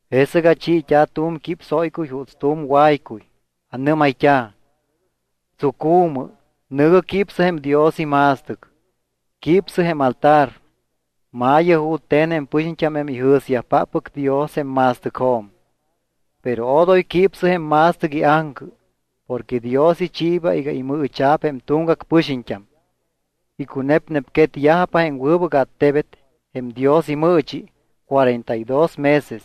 Jesɨc achiit́a̱ tu̱m quípsóycuy juuts tu̱m waycuy. Anɨ́mayt́a̱: —Tsucu̱mɨ. Nɨ̱gɨ quípsɨ jém Dios ima̱stɨc. Quípsɨ jém altar. Ma̱yɨ jute̱n jém pɨxiñt́am jém ijɨ̱syajpáppɨc Dios jém ma̱stɨcjo̱m. Pero odoy quípsɨ jém ma̱stɨc iaŋcɨ. Porque Dios ichiiba iga imɨɨcha̱p jém tuŋgac pɨxiñt́am. Icunepnepquetyajpa jém wɨbɨc attebet, jém Dios imɨɨchi, cuarenta y dos meses.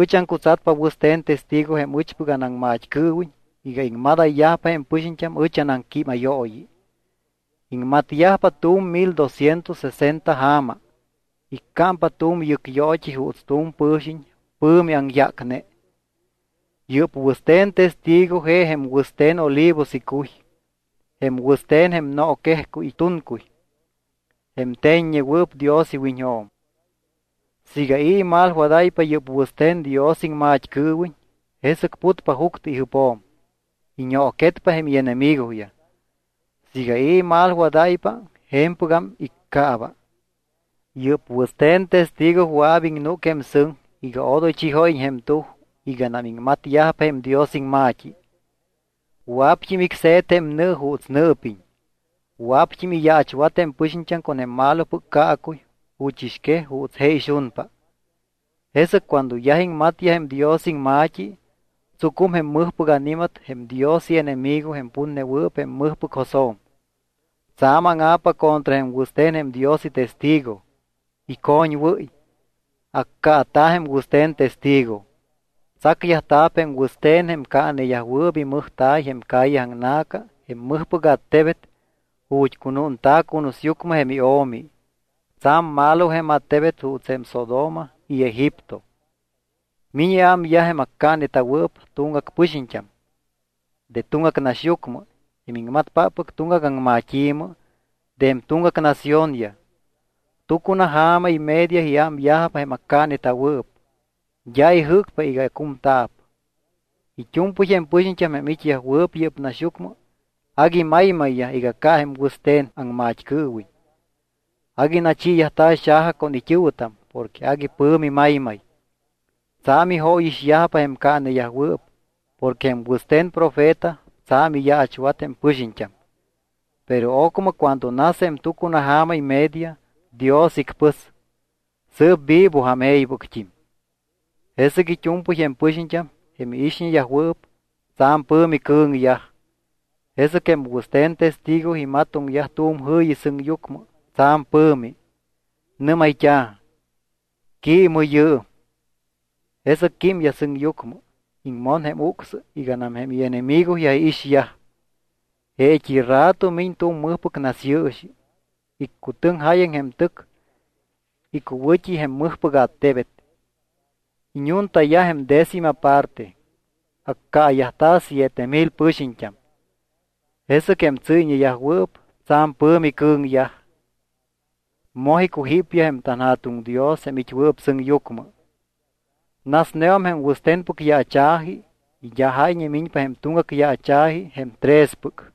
Ɨch aŋcutsatpa wɨste̱n testigo jém ɨchpɨc anaŋmat́cɨɨwiñ iga iŋmadayyajpa jém pɨxiñt́am ɨch anaŋquímayooyi. Iŋmatyajpa tu̱m mil doscientos sesenta ja̱ma. Iccámpa tu̱m yɨcyoot́i juuts tu̱m pɨ̱xiñ pɨ̱mi aŋyácne. Yɨ́p wɨste̱n testigo je jém wɨste̱n olivos icuy, jém wɨste̱n jém nooquejcuy tuncuy, jém te̱ññewɨɨp Dios iwiñjo̱m. Siiga i̱ imalwadáypa yɨ́p wɨste̱n Dios iŋmat́cɨɨwiñ jesɨc putpa juctɨ ijɨpjo̱m, iñooquetpa jém ienemigoyaj. Siiga i̱ imalwadáypa, je̱mpɨgam iccaaba. Yɨ́p wɨste̱n testigo wɨa̱p iŋnúc jém sɨŋ iga odoy chijóyiñ jém tuj iganam iŋmatyajpa jém Dios iŋma̱t́i. Wɨa̱pt́im icse̱t jém nɨ juuts nɨɨpiñ. Wɨa̱pt́im iyaachwat jém pɨxiñt́am con jém malopɨc caacuy juchɨxquej juuts je ixunpa. Jesɨc cuando yaj iŋmatyaj jém Dios iŋma̱t́i, tsucum jém mɨjpɨc ani̱mat jém Dios ienemigo jém putnewɨɨp jém mɨjpɨc josjo̱m. Tsa̱m áŋa̱pa contra jém wɨste̱n jém Dios itestigo, icoñwɨ́y. Accaata̱ jém wɨste̱n testigo. Tsacyajta̱p jém wɨste̱n jém caaneyajwɨɨp imɨjta̱y jém calle aŋna̱ca jém mɨjpɨc attebet ju̱t́ cunúnta̱ cunusyucmɨ jém iO̱mi. Tsa̱m malo jém attebet juuts jém Sodoma y Egipto. Miñ iámyaj jém accaaneta̱wɨɨp tuŋgac pɨxiñt́am, de tuŋgac naxyucmɨ, jém iŋmatpáppɨc tuŋgac aŋmat́i̱mɨ, de jém tuŋgac naciónyaj. Tucunaja̱ma y media iámyajpa jém accaaneta̱wɨɨp. D́a ijɨ́cpa iga cumta̱p. It́u̱mpɨy jém pɨxiñt́am jém it́yajwɨɨp yɨ́p naxyucmɨ agui maymayyaj iga ca jém wɨste̱n aŋmat́cɨɨwiñ. Agui nachiiyajta̱ xaja con it́ɨ̱wɨtam porque agui pɨ̱mi maymay. Tsa̱m ijóyixyajpa jém caaneyajwɨɨp porque jém wɨste̱n profeta tsa̱m iyaachwat jém pɨxiñt́am. Pero ocmɨ cuando nas jém tucunaja̱ma y media, Dios icpɨs. Sɨɨp vivojam e̱ybɨct́im. Jesɨc it́u̱mpɨy jém pɨxiñt́am, jém iixñeyajwɨɨp, tsa̱m pɨ̱mi cɨ̱ŋyaj. Jesɨc jém wɨste̱n testigo imatoŋyaj tu̱m jɨ̱yi sɨŋyucmɨ tsa̱m pɨ̱mi. Nɨ́mayt́a̱: —Quiimɨ yɨɨm. Jesɨc químyaj sɨŋyucmɨ, iŋmon jém ucsɨ iganam jém ienemigoyaj iixyaj. Jeet́i rato miñ tu̱m mɨjpɨc nasyɨɨxi. Iccutɨŋ jáyaŋ jém tɨc icuwɨ̱t́i jém mɨjpɨc attebet. Iñuntayaj jém décima parte. Accaayajta̱ siete mil pɨxiñt́am. Jesɨc jém tsɨ́yñeyajwɨɨp tsa̱m pɨ̱mi cɨ̱ŋyaj. Moj icujípyaj jém tanJa̱tuŋ Dios jém it́wɨɨp sɨŋyucmɨ. Nasneum jém wɨste̱npɨc yaacha̱ji y d́a jáyñe miñpa jém tuŋgac yaacha̱ji jém trespɨc.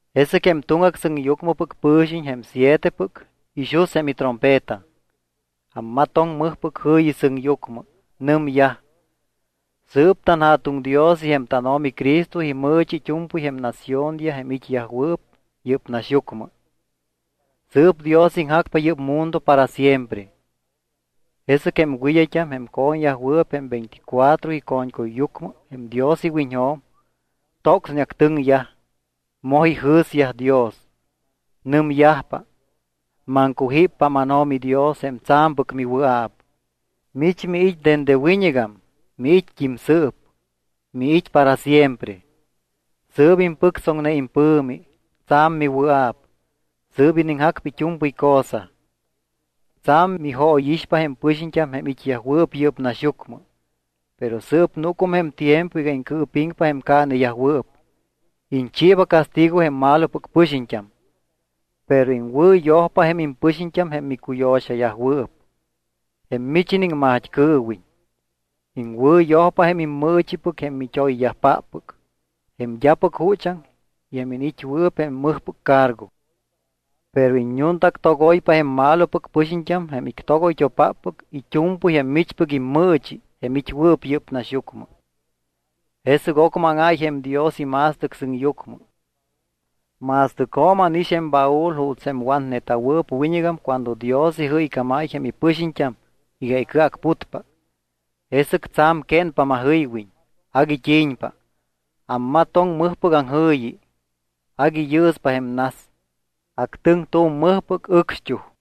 Jesɨc jém tuŋgac sɨŋyucmɨpɨc pɨ̱xiñ, jém sietepɨc, ixus jém itrompeta. Ammatoŋ mɨjpɨc jɨ̱yi sɨŋyucmɨ. Nɨmyaj: Sɨɨp tanJa̱tuŋ Dios y jém tánO̱mi Cristo imɨɨchi it́u̱mpɨy jém naciónyaj jém it́yajwɨɨp yɨ́p naxyucmɨ. Sɨɨp Dios iŋjacpa yɨ́p mundo para siempre. Jesɨc jém wɨd́ayt́am, jém co̱ñyajwɨɨp jém veinticuatro ico̱ñcuyyucmɨ jém Dios iwiñjo̱m, tocsneactɨŋyaj. Moj ijɨ̱syaj Dios. Nɨmyajpa: Maŋcujíppa mánO̱mi Dios jém tsa̱mpɨc miwɨa̱p. Mich miit́ dende wiñɨgam, miit́t́im sɨɨp, miit́ para siempre. Sɨɨp impɨctsoŋne impɨ̱mi, tsa̱m miwɨa̱p. Sɨɨp iniŋjacpa it́u̱mpɨy cosa. Tsa̱m mijóyixpa jém pɨxiñt́am jém it́yajwɨɨp yɨ́p naxyucmɨ. Pero sɨɨp núcum jém tiempo iga iŋcɨɨpiŋpa jém caaneyajwɨɨp. Iñchiiba castigo jém malopɨc pɨxiñt́am. Pero iŋwɨ̱yojpa jém impɨxiñt́am jém micuyo̱xayajwɨɨp, jém mich iniŋmat́cɨɨwiñ. Iŋwɨ̱yojpa jém immɨɨchipɨc jém mit́oyyajpáppɨc, jém d́apɨc juchaŋ y jém iniit́wɨɨp jém mɨjpɨc cargo. Pero iññuntaactogoypa jém malopɨc pɨxiñt́am jém ictogoytopáppɨc it́u̱mpɨy jém michpɨc immɨɨchi jém it́wɨɨp yɨ́p naxyucmɨ. Jesɨc ocmɨ áŋáy jém Dios ima̱stɨc sɨŋyucmɨ. Ma̱stɨcjo̱m ánix jém baúl juuts jém watneta̱wɨɨp wiñɨgam cuando Dios ijɨycámáy jém ipɨxiñt́am iga icɨacputpa. Jesɨc tsa̱m quénpa majɨywiñ, agui t́i̱ñpa. Ammatoŋ mɨjpɨc aŋjɨ̱yi. Agui yɨɨspa jém nas. Actɨŋ tu̱m mɨjpɨc ɨcxt́uj.